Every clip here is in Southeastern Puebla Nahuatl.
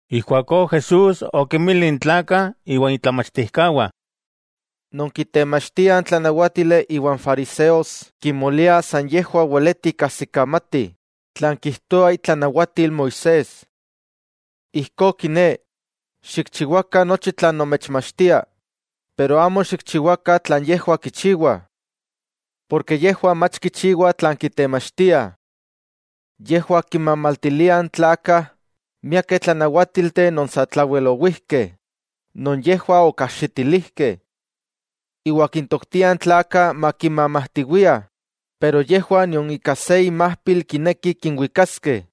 Ijkuakó Jesús okinmili n tlakah iwa itlamachtijkawah: —Non kitemachtiah n tlanawátili iwa n fariseos kimoliah san yejwah weleti kajsikamatih tlan kijtoa itlanawatil Moisés. Ijkó kiné, xikchiwakah nochi tlan nomechmachtiah, pero amo xikchiwakah tlan yejwah kichiwah. Porke yejwah mach kichiwah tlan kitemachtiah. Yejwah kinmamaltiliah n tlakah miakeh tlanawátilteh non satlawel owijkeh non yejwah okajxitilijkeh. Iwa kintoktiah n tlakah makimamajtiwiah, pero yejwah nion ika se inmajpil kinekih kinwikaskeh.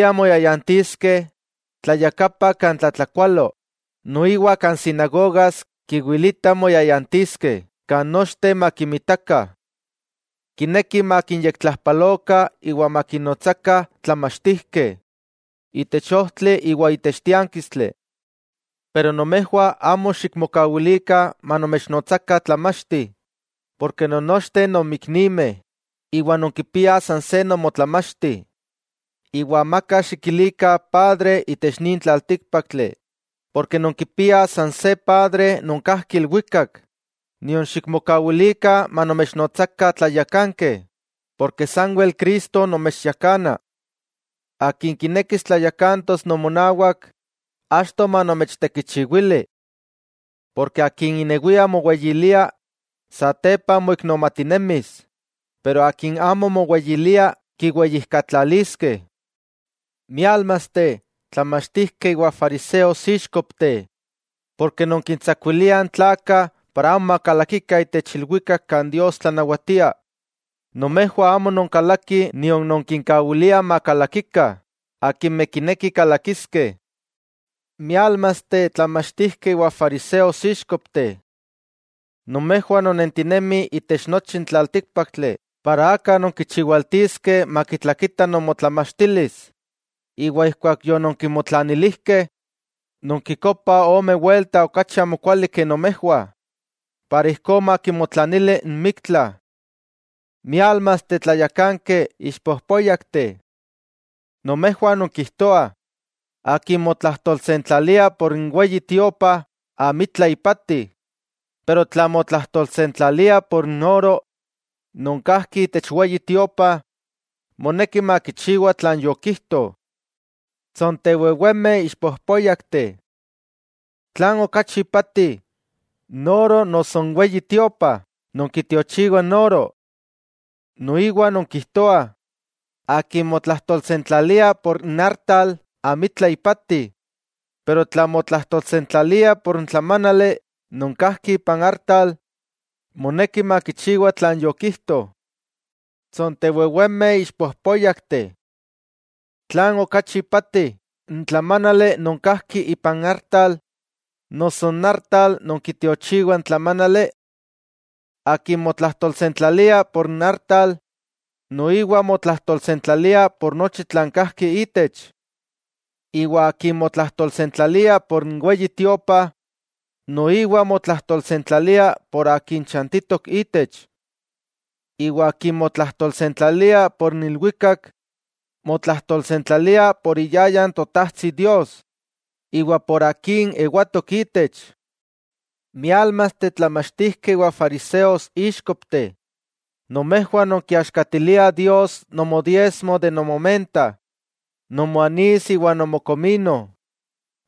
Kimpaktiah moyayantiskeh tlayakapa kan tlatlakualo, noiwa kan sinagogas kiwilitah moyayantiskeh kan nochteh makinmitakah. Kinekih makinyektlajpalokah iwa makinnotsakah “tlamachtijkeh” itech ojtli iwa itech tiánkistli. 'Pero nomejwah amo xikmokawilikah manomechnotsakah tlamachti, porke non nochteh nonmiknimeh iwa nonkipiah san se Nomotlamachti. Iwa amaka xikilikah padre itech nin tlaltíkpaktli, porke nonkipiah san se Padre non kajki ilwikak. Nion xikmokawilikah manomechnotsakah “tlayakankeh”, porke sanwel Cristo nomechyakana. Akin kinekis tlayakantos nomonawak, achto manomechtekichiwili. Porke akin inewia moweyilia, satepa moiknomatinemis, pero akin amo moweyilia, kiweyijkatlaliskeh. '¡Miálmasteh, tlamachtijkeh iwa fariseos, íxkopteh!, porke nonkintsakuiliah n tlakah para amo makalakikah itech ilwikak kan Dios tlanawatia. Nomejwah amo nonkalakih nion nonkinkawiliah makalakikah akimeh kinekih kalakiskeh. '¡Miálmasteh tlamachtijkeh iwa fariseos, íxkopteh! Nomejwah non nentinemih itech nochi n tlaltíkpaktli para aka nonkichiwaltiskeh makitlakita nomotlamachtilis, iwa ijkuak yononkimotlanilijkeh, nonkikopah ome welta okachi amokuali ke nomejwah iwa ijkó makimotlanili n miktla. '¡Miálmasteh, tlayakankeh ixpojpóyakteh! Nomejwah nonkijtoah: “Akin motlajtolsentlalia por n Weyi Tiopa amitla ipati, pero tla motlajtolsentlalia por n ‘oro’ non kajki itech Weyi Tiopa, moneki makichiwa tlan yokijto.” ¡Tsontewewemeh ixpojpóyakteh! ¿Tlan okachi ipati: N oro, noso n Weyi Tiopa, non kitiochiwa n oro? Noiwa nonkijtoah: “Akin motlajtolsentlalia por n artal, amitla ipati, pero tla motlajtolsentlalia por n tlamánali non kajki ipan artal, moneki makichiwa tlan yokijto.” ¡Tsontewewemeh ixpojpóyakteh! ¿Tlan okachi ipati, n tlamánali non kajki ipan artal, noso n artal non kitiochiwa n tlamánali? Akin motlajtolsentlalia por n artal, noiwa motlajtolsentlalia por nochi tlan kajki itech. Iwa akin motlajtolsentlalia por n Weyi Tiopa, noiwa motlajtolsentlalia por Akin chantitok itech. Iwa akin motlajtolsentlalia por n ilwikak, motlajtolsentlalia por iyayan Totajtsi Dios, iwa por Akin ewatok itech. '¡Miálmasteh, tlamachtijkeh iwa fariseos, íxkopteh! Nomejwah nonkiaxkatiliah Dios nomodiesmo de nomomenta, nomoanis iwa nomokomino,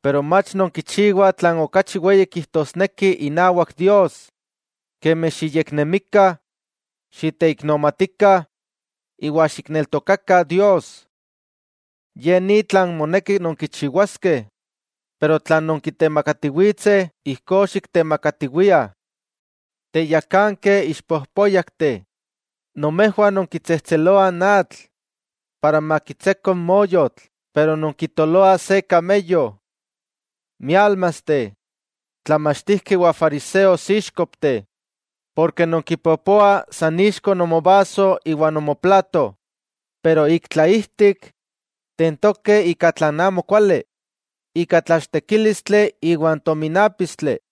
pero mach nonkichiwah tlan okachi weyi kijtosneki inawak Dios, kemi xiyeknemikah, xiteiknomatikah iwa xikneltokakah Dios. Ye ni tlan moneki nonkichiwaskeh, pero tlan nonkitemakatiwitseh ijkó xiktemakatiwiah. ¡Teyakankeh ixpojpóyakteh, nomejwah nonkitsejtseloah n atl para makitseko n moyotl pero nonkitoloah se kameyo! '¡Miálmasteh, tlamachtijkeh iwa fariseos, íxkopteh!, porke nonkipopoah san ixko nomovaso iwa nomoplato, pero ik tlaijtik tentokeh ika tlan amokuali, ika tlachtekílistli iwa n tominápistli.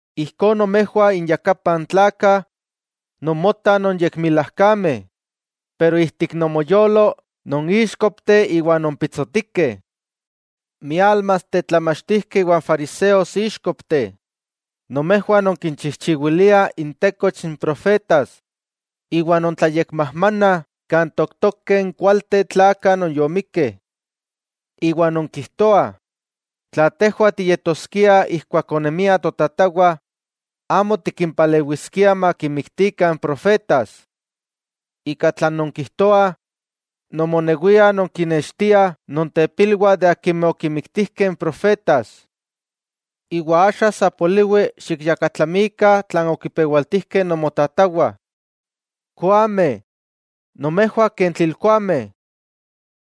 Ijkó nomejwah inyakapah n tlakah nonmotah nonyekmilajkameh, pero ijtik nomoyolo non íxkopteh iwa non pitsotikeh. '¡Miálmasteh, tlamachtijkeh iwa fariseos íxkopteh!, nomejwah nonkinchijchiwiliah intekoch n profetas iwa nontlayekmajmanah kan tooktokeh n kualteh tlakah non yomikkeh. Iwa nonkijtoah: “Tla tejwah tiyetoskiah ijkuak onemiah totatawah, amo tikimpalewiskiah makinmiktikah n profetas.” Ika tlan nonkijtoah, nomonewiah nonkinextiah nontepilwah de akimeh okinmiktijkeh n profetas. ¡Iwa axa sa poliwi xikyakatlamikah tlan okipewaltijkeh nomotatawah! '¡Koameh! ¡Nomejwah ken tlilkoameh!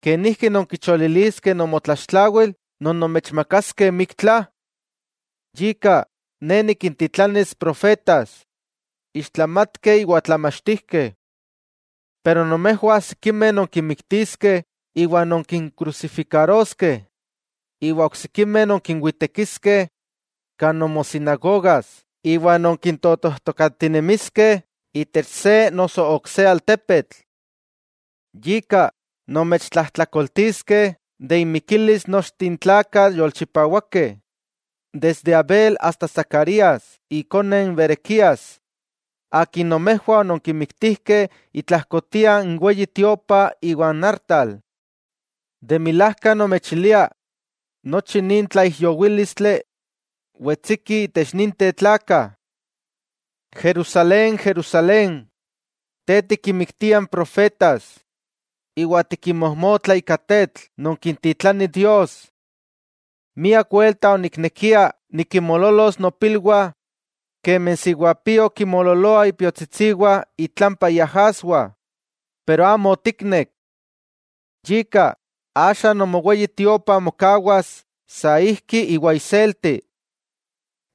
¿Kenijki nonkicholiliskeh nomotlaxtlawil non nomechmakaskeh miktla? Yika, Ne nikintitlanis, profetas, ixtlamatkeh iwa tlamachtijkeh. Pero nomejwah sikimeh nonkinmiktiskeh iwa nonkinkrusifikaroskeh, iwa oksikimeh nonkinwitekiskeh kan nomosinagogas iwa nonkintotojtokatinemiskeh itech se noso ok se altepetl. Yika, nomechtlajtlakoltiskeh de inmikilis nochteh n tlakah yolchipawakeh, desde Abel asta Zacarías ikone n Berequías, akin nomejwah ononkimiktijkeh itlajkotia n Weyi Tiopa iwa n artal. De milajka nomechilia, nochi nin tlaijyowílistli wetsiki itech ninteh tlakah. '¡Jerusalén, Jerusalén, te tikinmiktia n profetas iwa tikinmojmotla ika tetl non kintitlani Dios! ¡Miak welta oniknekia nikinmoololos mopilwah kemi n siwapio kinmoololoa ipiotsitsiwah itlampa iajaswah, pero amo otiknek! Yika, axa nomo Weyi Tiopa mokawas saijki iwa iselti.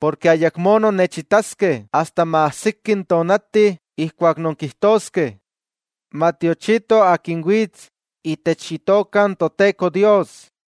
Porke ayakmó nonnechitaskeh asta maajsiki n tonati ijkuak nonkijtoskeh: “Matiochito Akin wits itech Itoka n Toteko Dios.”